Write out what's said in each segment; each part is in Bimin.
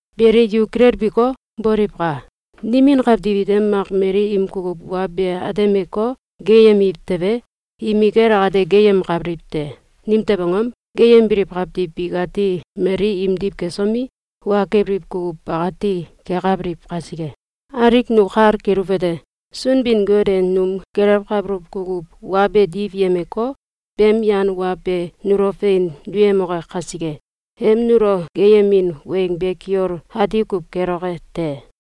Beli, yu kilelbiko, boliwka! Nimin kawtiw ite mak mali im kukuw wa be atemeko, geeyemiw tewe, imikel akate geeyemkabiliw te. Nimtew angom? Geeyembiliw kawtiw bikati mali imdiw kesomi, wa kebiliw kukuw bakati kekabiliw kasike. Alik nu kal keluwete: Sunbin-Got e num gelewkabuluw kukuw wa be diwyemeko, beem yan wa be nulo fein duyemoke kasike, em nulo geeyemin weng be kiol ati kuw keloke te.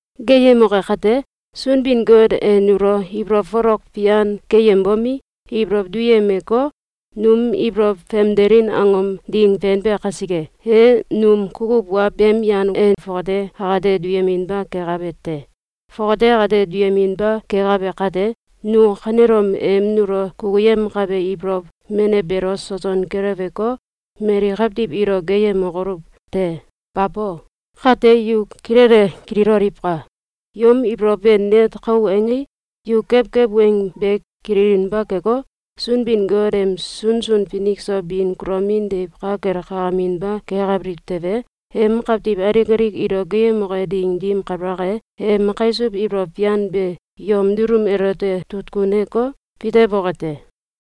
Geeyemoke kate, Sunbin-Got e nulo ibolow folok fian keyembomi, ibolow duyemeko, num ibolow famdelin angom ding fenbe kasike, e num kukuw wa beem yan e fongate akate duyeminba kekabe te. Fongate akate duyeminba kekabe kate, nu kanelom em nulo kukuyemkabe ibolow menew beelo soson keleweko, mali kawtiw ilo geeyemokoluw te! Babo! Kate yu kilele kililoliwka! Yom ibolow be net kau angei, yu kewkew weng be kililinba keko, Sunbin-Got em sunsun finik so bin kulomin deiw ka kel kakaminba kekabiliw tewe, em kawtiw alik alik ilo geeyemoke ding dim kabalak e, em kaisuw ibolow fian be yom dulum elote tutkuneko, fitewoke te.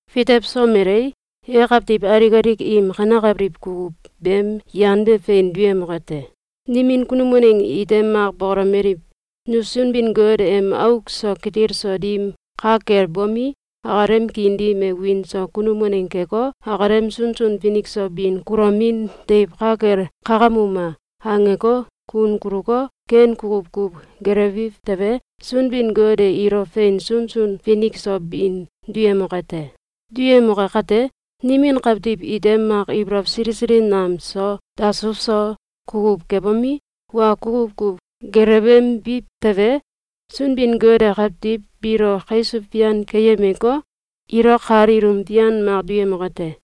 Fitewsomelei, e kawtiw alik alik im kanekabiliw kukuw beem yan be fein duyemoke te. Nimin kunum waneng ite mak bokolomeliw: “Nu Sunbin-Got em auk so kitil so dim ka kel bomi, akalem kiin dim e wiin so kunum waneng keko, akalem sunsun finik so bin kulomin deiw ka kel kakamuma!”, angeko, kun kuluko, ken kukuw kuw gelewbiw tewe, Sunbin-Got e ilo fein sunsun finik so bin duyemoke te. Duyemoke kate, nimin kawtiw ite mak ibolow sili sili nam so, dasuw so, kukuw kebomi, wa kukuw kuw gelewembiw tewe, Sunbin-Got e kawtiw biilo kaisuw fian keyemeko, ilo kal ilum fian mak duyemoke te.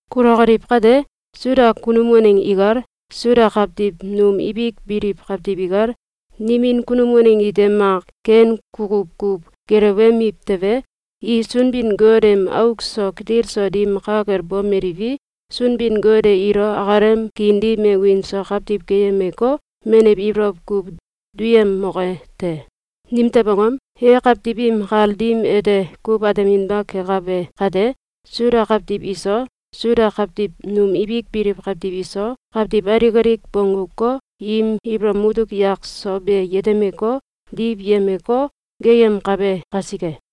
Kulokoliw kate, Suda kunum waneng ikal, Suda kawtiw num ibik biliw kawtiw ikal, nimin kunum waneng ite mak ken kukuw kuw gelewemiw tewe, i Sunbin-Got em auk so kitil so dim ka kel bomeliwi, Sunbin-Got e ilo akalem kiin dim e wiin so kawtiw keyemeko, menew ibolow kuw duyemoke te. Nimtew angom? E kawtiw im kal dim ete kuw ateminba kekabe kate, Suda kawtiw iso, Suda kawtiw num ibik biliw kawtiw iso, kawtiw alik alik bongguko, im ibolow mutuk yak so be yetemeko, diwyemeko, geeyemkabe kasike.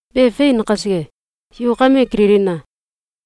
Be fein kasike, yu kame kililina!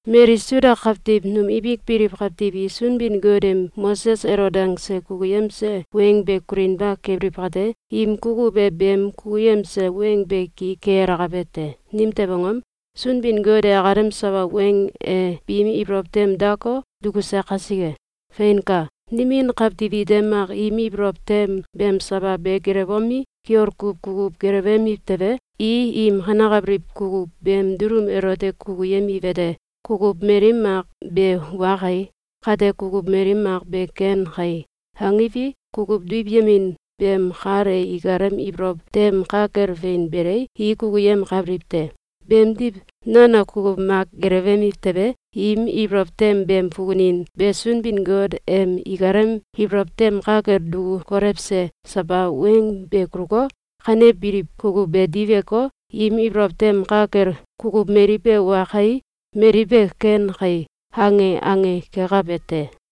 Mali Suda kawtiw num ibik biliw kawtiw i Sunbin-Got em Moses elo dangse kukuyemse weng be kulinba kebiliw kate, im kukuw e beem kukuyemse weng be ki ke alakabe te. Nimtew angom? Sunbin-Got e akalem sawa weng e biim ibolow tem dako, dukuse kasike. Feinka! Nimin kawtiw ite mak im ibolow tem beem sawa be gelewbomi, kiol kuw kukuw gelewemiw tewe, i im kanekabiliw kukuw beem dulum elote kukuyemiwete: “Kukuw mali mak be wa kai! Kate kukuw mali mak be ken kai!”, angiwi, kukuw diwyemin beem kal e ikalem ibolow tem ka kel fein belei, i kukuyemkabiliw te. Beemdiw, nono kukuw mak gelewemiw tewe, im ibolow tem beem fukunin be Sunbin-Got em ikalem ibolow tem ka kel duku kolewse sawa weng be kuluko, kanebiliw kukuw be diweko, im ibolow tem ka kel “Kukuw mali be wa kai! Mali be ken kai!”, ange ange kekabe te.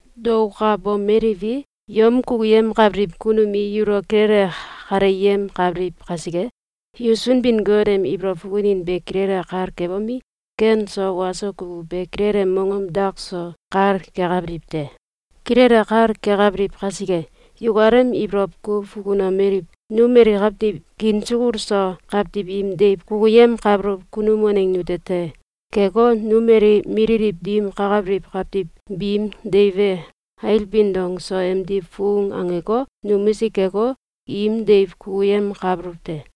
Daokabomeliwi, yom kukuyemkabiliw kunum i yulo kilele kaleyemkabiliw kasike, yu Sunbin-Got em ibolow fukunin be kilele kal kebomi, ken so wa so kukuw be kilele mongom dak so kal kekabiliw te. Kilele kal kekabiliw kasike, yukalem ibolow kuw fukunomeliw: “Nu mali kawtiw kiin sukul so kawtiw im deiw kukuyemkabuluw kunum waneng nute te! Keko, nu mali mililiw dim kakabiliw kawtiw biim deiw be ailbin dong so emdiw fung angeko, numisik keko, im deiw kukuyemkabuluw te!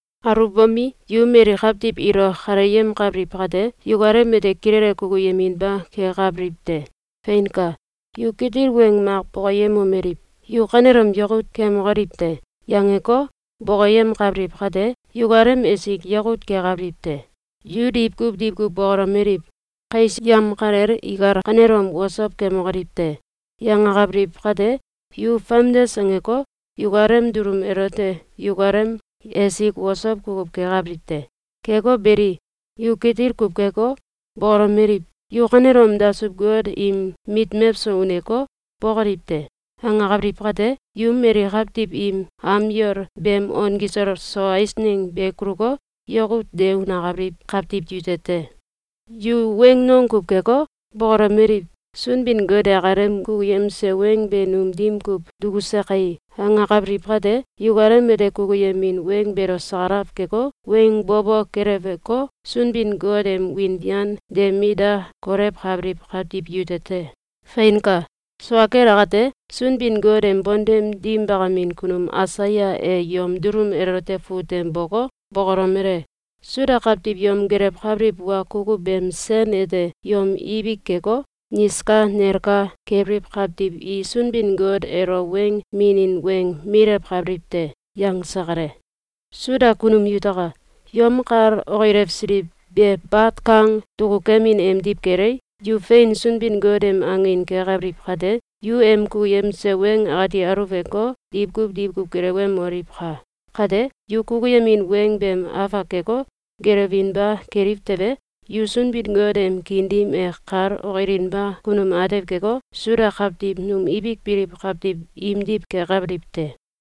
Aluwbomi, yu mali kawtiw ilo kaleyemkabiliw kate, yukalem ete kilele kukuyeminba kekabiliw te. Feinka! Yu kitil weng mak bokoyemomeliw: “Yu kanelom yakut kemokoliw te!”, yangeko, bokoyemkabiliw kate, yukalem esik yakut kekabiliw te! Yu diwkuw diwkuw bokolomeliw: “Kais yamkalel ikal kanelom osow kemokoliw te!”, yangakabiliw kate, yu famdes angeko, yukalem dulum elote yukalem esik osow kukuw kekabiliw te. Keko beli, yu kitil kuw keko, bokolomeliw: “Yu kanelom dasuw-got im mit mewso uneko, bokoliw te!”, angakabiliw kate, yu mali kawtiw im am yol beem on kisol so eisneng be kuluko, yakut de unakabiliw kawtiw yute te. Yu weng nong kuw keko, bokolomeliw: “Sunbin-Got e akalem kukuyemse weng be num dim kuw dukuse kai!”, angakabiliw kate, yukalem ete kukuyemin weng beelo sakalaw keko, weng bo bo keleweko, Sunbin-Got em wiin fian de mit da kolewkabiliw kawtiw yute te. Feinka! Sua kel akate, Sunbin-Got em bontem dim bakamin kunum Aisaya e yom dulum elote fut tem boko, bokolomele: “Suda kawtiw yom gelewkabiliw wa kukuw beem sen ete yom ibik keko, niska nelka kebiliw kawtiw i Sunbin-Got elo weng minin weng milewkabiliw te.”, yangse kale. Suda kunum yutaka! Yom kal okilewsiliw be bat kang dukukemin emdiw kelei, yu fein Sunbin-Got em angin kekabiliw kate, yu em kukuyemse weng akati aluweko, diwkuw diwkuw gelewemoliwka! Kate, yu kukuyemin weng beem afak keko, gelewinba keliw tewe, yu Sunbin-Got em kiin dim e kal okilinba kunum atew keko, Suda kawtiw num ibik biliw kawtiw imdiw kekabiliw te.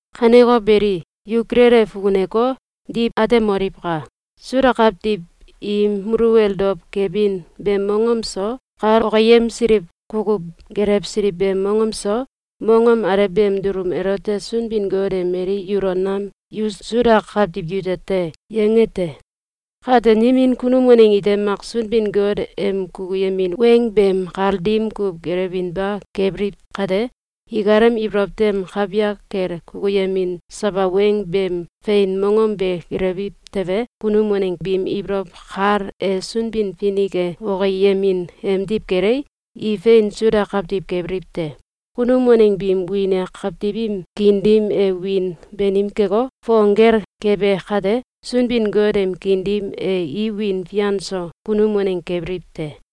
Kaneko beli, yu kilele fukuneko, diw atemoliwka! Suda kawtiw im muluwel dow kebin beem mongom so, kal okiyemsiliw kukuw gelewsiliw beem mongom so, mongom alew beem dulum elote Sunbin-Got e mali yulo nam “Yu Suda kawtiw yute te!”, yange te. Kate, nimin kunum waneng ite mak Sunbin-Got em kukuyemin weng beem kal dim kuw gelewinba kebiliw kate, ikalem ibolow tem kawyak kel kukuyemin sawa weng beem fein mongom be gelewiw tewe, kunum waneng biim ibolow kal e Sunbin-Finik e okiyemin emdiw kelei, i fein Suda kawtiw kebiliw te. Kunum waneng biim wiin e kawtiw im kiin dim e wiin banim keko, fong gel kebe kate, Sunbin-Got em kiin dim e i wiin fian so kunum waneng kebiliw te.